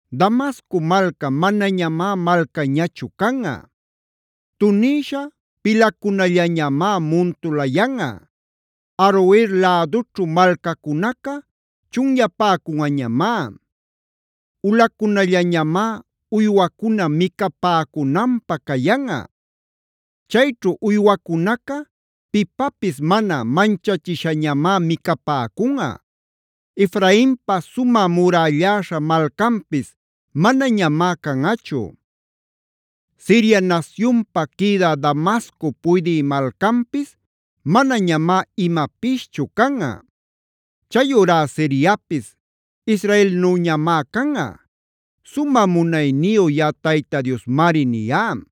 “Damasco malca manañamá malcañachu canꞌa; tunïsha pilacunallañamá muntulayanꞌa. Aroer lädućhu malcacunaca chunyapäcunꞌañamá; ulacunallañamá uywacuna micapäcunanpä cayanꞌa. Chayćhu uywacunaca pipapis mana manchachishañamá micapäcunꞌa. Efrainpa sumä murälläśha malcanpis manañamá canꞌachu; Siria nasyunpa quïdä Damasco puydï malcanpis manañamá imapischu canꞌa. Chayurá Siriapis Israelnüñamá canꞌa. Sumä munayniyu yaꞌa Tayta Diosmari niyá.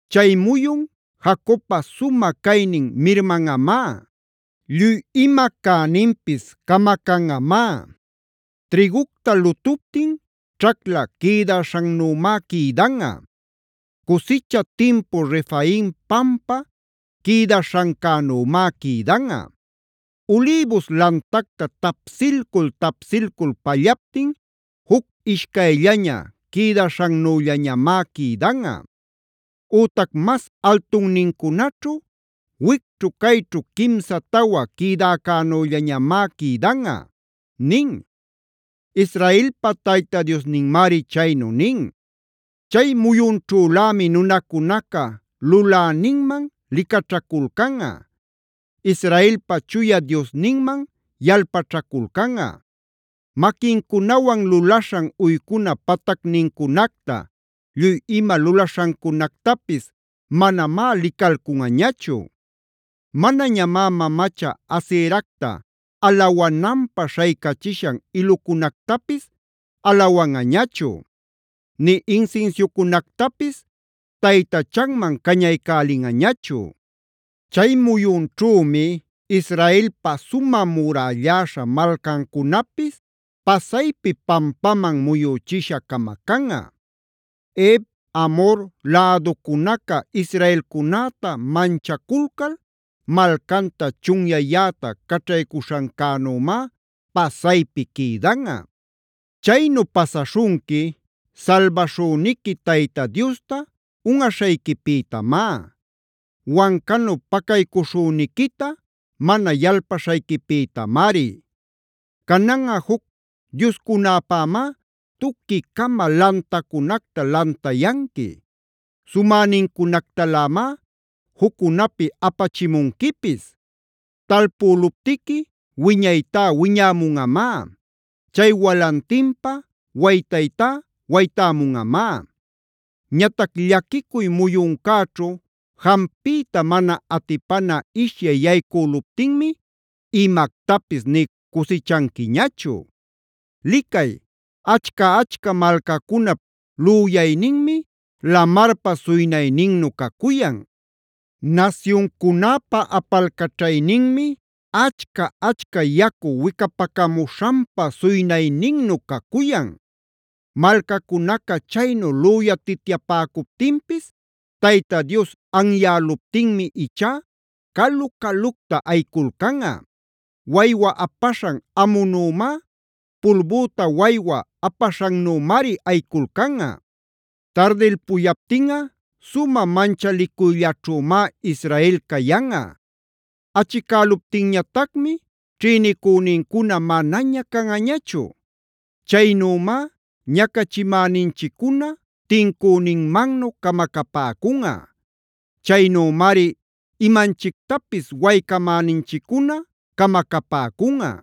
“Chay muyun Jacobpa sumä caynin mirmanꞌamá; lluy ima cäninpis camacanꞌamá. Trïgucta lutuptin ćhacla quïdaśhannümá quïdanꞌa; cusicha timpu Refaim pampa quïdaśhancänümá quïdanꞌa. Ulïbus lantacta tapsilcul-tapsilcul pallaptin juc ishcayllaña quïdaśhannüllañamá quïdanꞌa; ütac mas altunnincunaćhu, wicćhu cayćhu quimsa tawa quïdäcänüllañamá quïdanꞌa” nin. Israelpa Tayta Diosninmari chaynu nin. Chay muyunćhülämi nunacunaca Luläninman licaćhaculcanꞌa; Israelpa Chuya Diosninman yalpaćhaculcanꞌa. Maquincunawan lulaśhan uycuna patacnincunacta, lluy ima lulaśhancunactapis manamá licalcunꞌañachu. Manañamá mamacha Aseracta alawananpä śhaycachishan ilucunactapis alawanꞌañachu; nï insinsiucunactapis taytachanman cañaycälinꞌañachu. Chay muyunćhümi Israelpa sumä murälläśha malcancunapis pasaypi pampaman muyüchisha camacanꞌa; Hev, Amhor läducunaca israelcunäta manchaculcal malcanta chunyayäta caćhaycuśhancänümá pasaypi quïdanꞌa. Chaynu pasaśhunqui salbaśhüniqui Tayta Diosta unꞌaśhayquipïtamá; wancanu pacaycuśhüniquita mana yalpaśhayquipïtamari. Cananꞌa juc dioscunäpämá tuqui-cama lantacunacta lantayanqui; sumänincunactalämá juccunapi apachimunquipis. Talpüluptiqui wiñaytá wiñämunꞌamá; chay walantinpa waytaytá waytämunꞌamá. Ñatac llaquicuy muyuncäćhu jampiyta mana atipana ishyay yaycüluptinmi imactapis nï cusichanquiñachu. Licay, ¡achca-achca malcacunap lüyayninmi lamarpa suynayninnu cacuyan! ¡Nasyuncunäpa apalcaćhayninmi achca-achca yacu wicapacamuśhanpa suynayninnu cacuyan! Malcacunaca chaynu lüyatityapäcuptinpis Tayta Dios anyäluptinmi ichá calu-calucta ayiculcanꞌa. Waywa apaśhan amunümá, pulbüta waywa apaśhannümari ayiculcanꞌa. Tardilpuyaptinꞌa sumä manchalicuyllaćhümá Israel cayanꞌa. Achicäluptinñatacmi ćhïnicünincuna manaña canꞌañachu. Chaynümá ñacachimäninchiccuna tincüninmannu camacapäcunꞌa. Chaynümari imanchictapis waycamäninchiccuna camacapäcunꞌa.